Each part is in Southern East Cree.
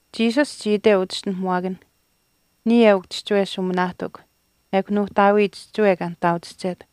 Jesus chii iteu uchischinuhamuwaakanh, “Niya eukw chihchiwe shuuminaahtikw ekw Nuuhtaawii chihchiwe kaa nihtaauchihchet.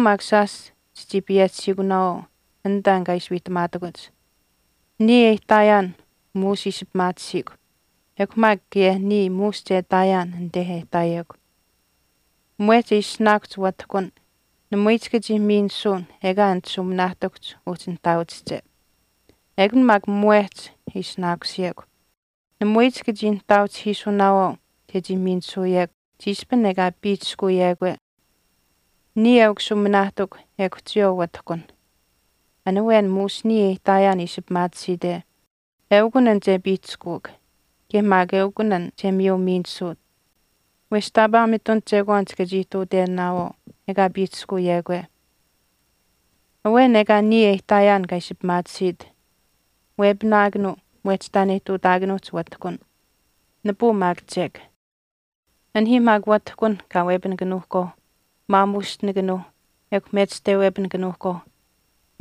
Chiyawaau maak shaash chichii payehchihiikunaawaau an taan kaa ishi wiihtamaatakuch. Niya e ihtaayaan muush ishi pimaatisiikw ekw maak kaye niya muush che ihtaayaan anite e ihtaayekw. Mwehch e ishinaakuhch watihkun namui chika chii miinisuun ekaa anit shuuminaahtikuhch uhchi nihtaauchihche. Ekun maak mwehch e ishinaakusiyekw. Namui chika chii nihtaauchihiisunaawaau chechii miinisuuyekw chiishpin ekaa piihchishkuuyekwe.” “Niya eukw shuuminaahtikw ekw chiyawaau watihkunh. An awen muush niya e ihtaayaan ishi pimaatisiite eukun an che piihchishkuuk kaye maak eukun an che miyu miinisuut wesh taapaa mitun chekwaan chika chii ihtuutenaawaau ekaa piihchishkuyekwe. Awen ekaa niya e ihtaayaan kaa ishi pimaatisiit wepinaakanuu mwehch taan e ihtuutaakanuuhch watihkun, nipuu maak chek. Anihiih maak watihkun kaa wepinikanuuhkwaau maamuushtinikanuuh ekw mechishtawepinikanuuhkwaau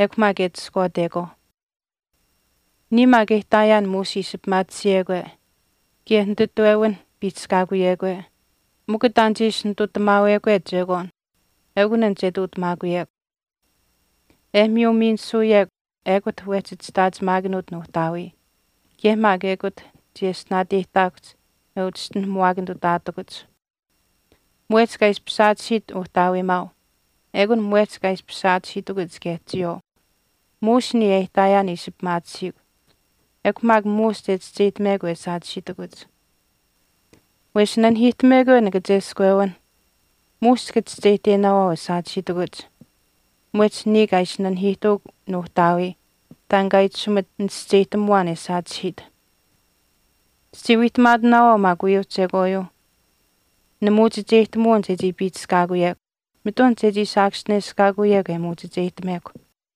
ekw maak e ati ishkwaatekwaau. Niya maak e ihtaayaan muush ishi pimaatisiyekwe kaye nititwewinh piihchishkaakuyekwe mikw taan che ishi nitutamaawekwe chekwaan eukun an che ihtuutamaakuyekw. E miyu miinisuyekw ekut wehchi chishtaachimaakanuut Nuuhtaawii, kaye maak ekut chiyeshtinaateyihtaakuhch e uchischinuhamuwaakanitutaatakuch. Mwehch kaa ishpish saachihiit Uhtaawiimaau ekun mwehch kaa ishpish saachihiitakuch kaye chiyawaau. Muush niya e ihtaayaan ishi pimaatisiikw ekw maak muush che chischeyihtamekw e saachihiitakuch. Wesh nanihiihtamekwe nikacheskwewinh muush chika chischeyihtenaawaau e saachihiitakuch mwehch niya kaa ishi nanihiihtuuk Nuuhtaawii taan kaa itashumit nichischeyihtamuwaan e saachihiit.” “Chichii wiihtamaatinaawaau maak uyuuh chekwaayuuh nimuchicheyihtamuwin chechii piihchishkaakuyekw mitun chechii saakaschineshkaakuyekw e muuchicheyihtamekw.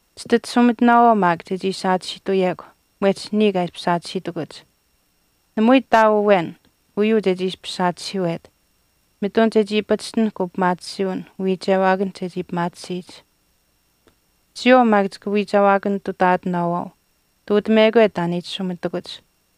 Chititashumitinaawaau maak chechii saachihiituyekw mwehch niya kaa ishpish saachihiitakuch. Namui ihtaau awen uyuu chechii ishpish saachihiiwet, mitun chechii pachishtinahk upimaatisiiwin uwiichewaakanh chechii pimaatisiyich. Chiyawaau maak chika wiichewaakanitutaatinaawaau ihtuutamekwe taan e itashumitakuch.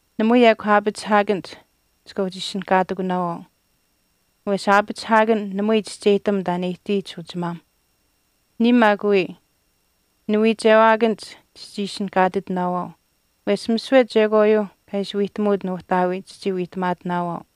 Namui ekw aapachihaakanich chika uhchi ishinihkaatitinaawaau wesh aapachihaakan namui chischeyihtam taan e ihtiyich uchimaam. Niya maak wii niwiichewaakanich chichii ishinihkaatitinaawaau wesh misiwe chekwaayuu kaa ishi wiihtamuut Nuuhtaawii chichii wiihtamaatinaawaau.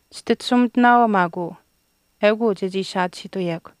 Chititashumitinaawaau maak uu, eukuu chechii saachihiituyekw.”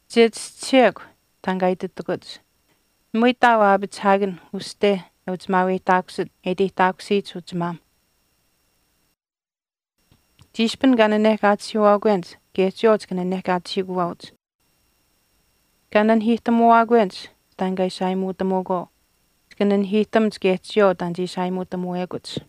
Che chischisiyekw taan kaa ititakuch, ‘Namui ihtaau aapachihaakan uste e uchimaaweyihtaakusit e iteyihtaakusiyich uchimaam.’ Chiishpin kaa nanehkaachihiiwaakwenich kaye chiyawaau chika nanehkaachihiikuwaauch. Kaa nanihiihtamuwaakwenich taan kaa ishi aayimuutamuukwaau chika nanihiihtamuch kaye chiyawaau taan che ishi aayimuutamuwekuch.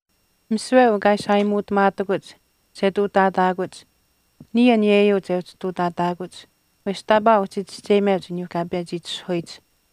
Misiwe uu kaa ishi aayimuutamaatakuch che ihtuutaataakuch niya aniyeyuu che uhchi ihtuutaataakuch wesh taapaa uhchi chischeyimeuch aniyuu kaa pechi itishahuyich.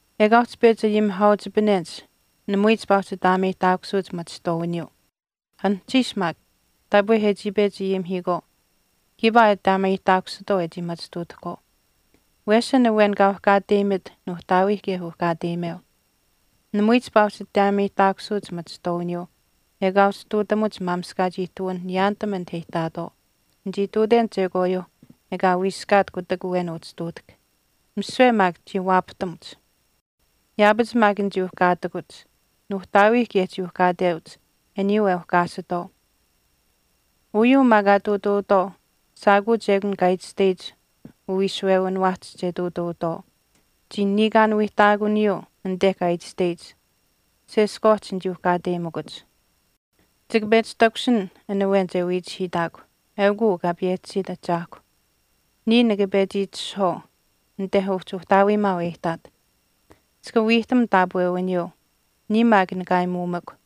Ekaa uhchi pechi ayimihaauchipanenich namui chipaa uhchi ataameyihtaakusuuch machihtwaawiniyuu. Anuhchiish maak taapwe e chii pechi ayimihiikwaau kiipaa e ataameyihtaakusitwaau e chii machituutahkwaau. Wesh an awen kaa uhkaateyimit Nuuhtaawiih kaye uhkaateyimeu. Namui chipaa uhchi ataameyihtaakusuuch machihtwaawiniyuu ekaa uhchi ihtuutamuch maamishkaach ihtuwin niyaanitam anit e ihtaatwaau. Nichii ihtuuten chekwaayuuh ekaa wiiskaat kutak awen uhchi ihtuutahk. Misiwe maak chii waapahtamuch. Yaapach maak nichii uhkaatikuch. Nuuhtaawiih kaye chii uhkaateuch aniyuu e uhkaasitwaau. Uyuu maak kaa ihtuutuutwaau shaakuuch ekun kaa itashteyich uwiishuwewiniwaahch che ihtuutuutwaau. Chii niikaan wiihtaakuniyuu anite kaa itashteyich, Seskwaahch nichii uhkaateyimikuch.” “Chika pechi takushin an awen che wiichihiitaakw, eukuu Kaa payehchisiit Ahchaahkw. Niya nikapechi itishahwaau anite uhchi Uhtaawiimaau e ihtaat. Chika wiihtam taapwewiniyuu. Niya maak nika aayimuumikw.